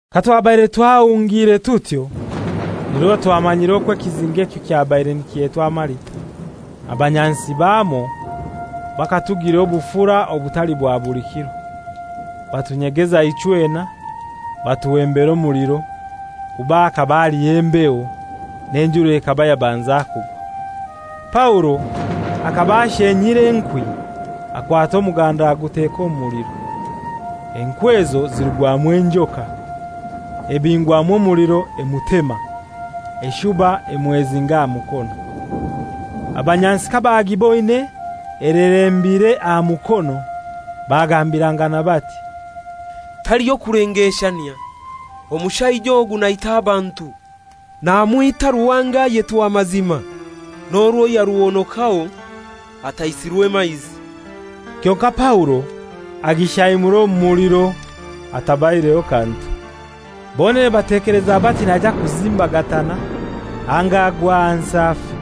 Katwabaire twahungire tutyo, nirwo twamanyire okwo ekizinga ekyo kyabaire nikyetwa Malita. Abanyansi bamwo bakatugilira obufura obutali bwa buli kiro. Batunyegeza ichwena, batuhembera omuliro, kuba hakaba haliyo embeho, n'enjura ekaba yabanza kugwa. Paulo akaba ashenyire enkwi, akwata omuganda aguteka omu muliro. Enkwi ezo zirugwamu enjoka, ebingwamu omuliro emutema, eshuba emwezinga aha mukono. Abanyansi kabagiboine elerembire aha mukono, bagambirangana bati, «Taliho kulengeshanyia, omushaija ogu naita abantu. Namwita ruhanga ayetwa Mazima, n'orwo yaruhonokaho ataisirwe maizi.» Kyonkai Paulo agishaimura omu muliro atabaireho kantu. Bonene batekeleza bati naija kuzimbagatana anga agwe ahansi afe.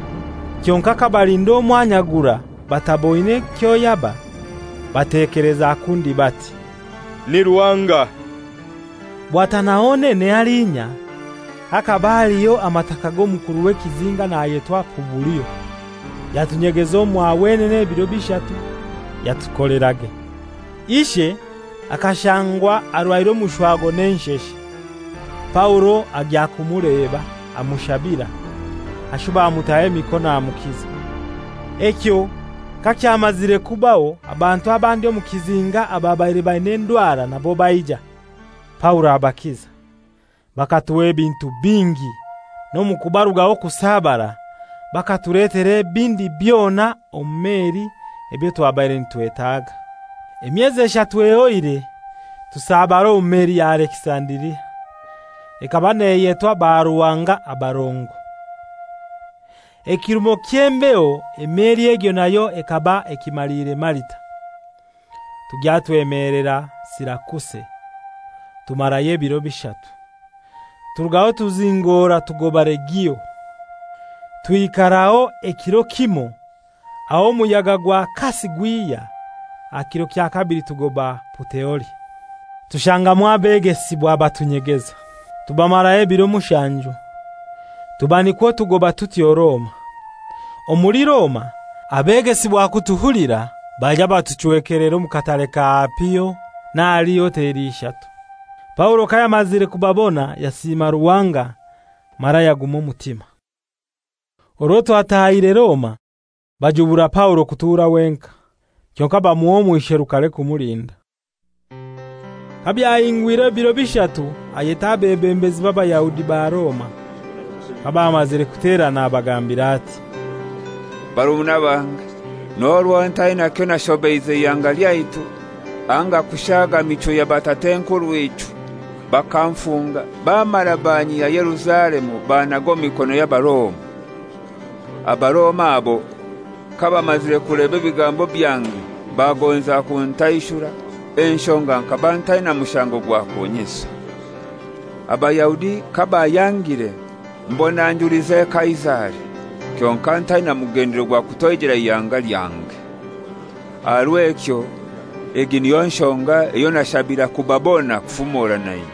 Kyonkai kabalinda omwanya gurai bataboine kyoyaba, batekeleza kundi bati, «Ni ruhanga.» Bwatana honene halinya hakaba haliho amataka g'omukuru w'ekizinga nayetwa Pubulio. Yatunyegeza omwa wenene ebiro bishatu, yatukolerage. Ishe akashangwa arwaire omushwago n'ensheshe. Paulo agya kumuleba, amushabira, ashuba amutaho emikono amukiza. Ekyo kakyamazire kubaho, abantu abandi omu kizinga ababaire baina endwara nabo baija, Paulo abakiza. Bakatuha ebintu bingi; n'omu kubarugaho kusabara bakatuletera ebindi byona omu meli ebyo twabaire nitwetaaga. Emyezi eshatu ehoire tusabara omu meli ya Alekisandiria, ekaba neyetwa Baruhanga Abarongo. Ekirumo ky'embeho emeli egyo nayo ekaba ekimaliire Malita. Tugya twemelera Sirakuse, tumarayo ebiro bishatu. Turugaho tuzingora tugoba Regio. Twikaraho ekiro kimoi, aho omuyaga gwa kasi gwihya, aha kiro kya kabili tugoba Puteoli. Tushangamu abegesibwa batunyegeza, tubamaraho ebiro mushanju. Tuba nikwo tugoba tutyo Roma. Omuli Roma abegesibwa kutuhulira baija batuchwekelera omu Katare ka Apio n'ahali Hoteli Ishatu. Paulo kayamazire kubabona yasiima Ruhanga mara yaguma omutima. Orwo twataahire Roma, bajubura Paulo kutura wenkai, kyonkai bamuha omwisherukare kumulinda. Kabyahingwire ebiro bishatu ayeta abebembezi b'Abayahudi ba Roma. Kabamazire kuterana abagambira ati, «Barumuna bange, n'orwo ntaina kyonashobeize ihanga lyaitu anga kushaaga michwo ya batat'enkurw'ichwe, bakanfunga bamara banyihya Yerusalemu bannaga omu mikono y'Abaroma. Abaroma abo kabamazire kuleba ebigambo byange bagonza kuntaishura, enshonga nkaba ntaina mushango gwa kunyisa. Abayahudi kabayangire mbona njulize Kaisari, kyonkai ntaina mugendelero gwa kutoijera ihanga yange. Aha rw'ekyo egi niyo nshonga eyo nashabira kubabona kufumora nainywe.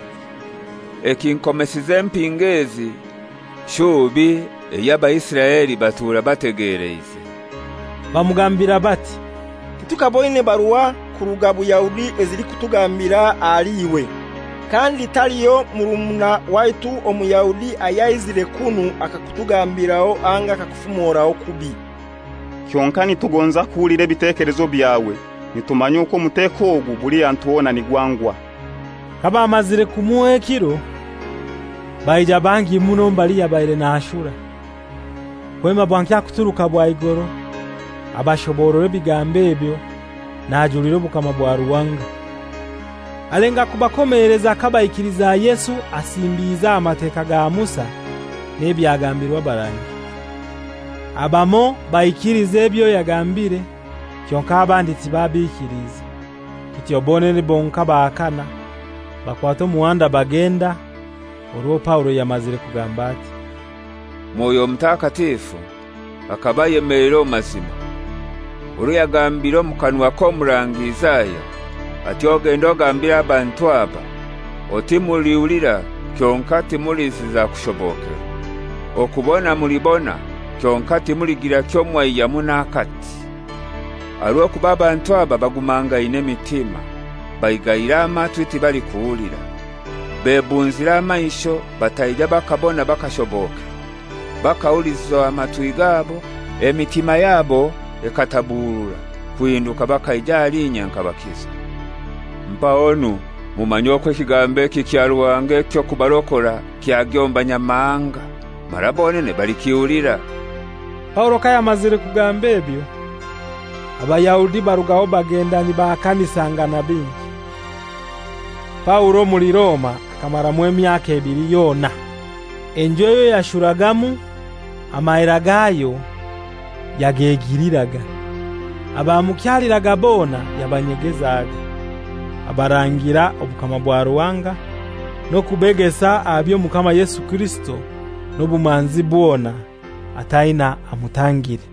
Ekinkomesize empingo ezi shubi ey'Abaisiraeli batura bategeleize.» Bamugambira bati, «Titukaboine barua kuruga Buyahudi ezilikutugambira ahali iwe. Kandi taliho murumuna waitu Omuyahudi ayaizire kunu akakutugambiraho anga akakufumoraho kubi. Kyonkai nitugonza kuhulira ebitekelezo byawe. Nitumanya okwo omuteko ogu buli hantu hona nigwangwa.» Kabamazire kumuha ekiro, baija bangi muno mbali yabaire nashura. Kwema bwankya kuturuka bwaigoro Abashoborora ebigambo ebyo, najulira obukama bwa Ruhanga. Alenga kubakomeleza kabaikiliza Yesu asimbiize aha Mateka ga Musa n'ebyagambirwe abarangi. Abamoi baikiliza ebyo yagambiire kyonkai abandi tibabikiliize. Kityo bonene bonkai bahakana, bakwata omuhanda bagenda, orwo Paulo yamazire kugamba ati, «Mwoyo Mutakatifu akaba ayemeleire omu mazima orwo yagambire omu kanwa k'Omurangi Isaya ati, ‹Ogende ogambire abantu aba oti: Mulihulira kyonkai timuliziza kushobokerwa, okubona mulibona, kyonkai timuligira kyomwaihyamu n'akati. Aha rw'okuba abantu aba bagumangaine emitima, baigaire amatwi tibalikuhulira, bebunzire amaisho bataija bakabona bakashobokerwa, bakahuliza matwi gabo, emitima yabo ekataburura, kuhinduka bakaija ahali inye nkabakiza.› Mpahonu mumanye okwo ekigambo eki kya Ruhanga eky'okubarokora kyagya omu Banyamahanga, mara bonene balikihulira.» [ Paulo kayamazire kugamba ebyo, Abayahudi barugaho bagenda nibahakanisangana bingi.] Paulo omuli Roma akamaramu emyaka ebili yona. Enju eyo yashuragamu amahera gayo yagegiliraga. Abamukyaliraga bona yabanyegezaga, abarangira obukama bwa Ruhanga, n'okubegesa aha by'Omukama Yesu Kirisito n'obumanzi bwona, ataina amutangire.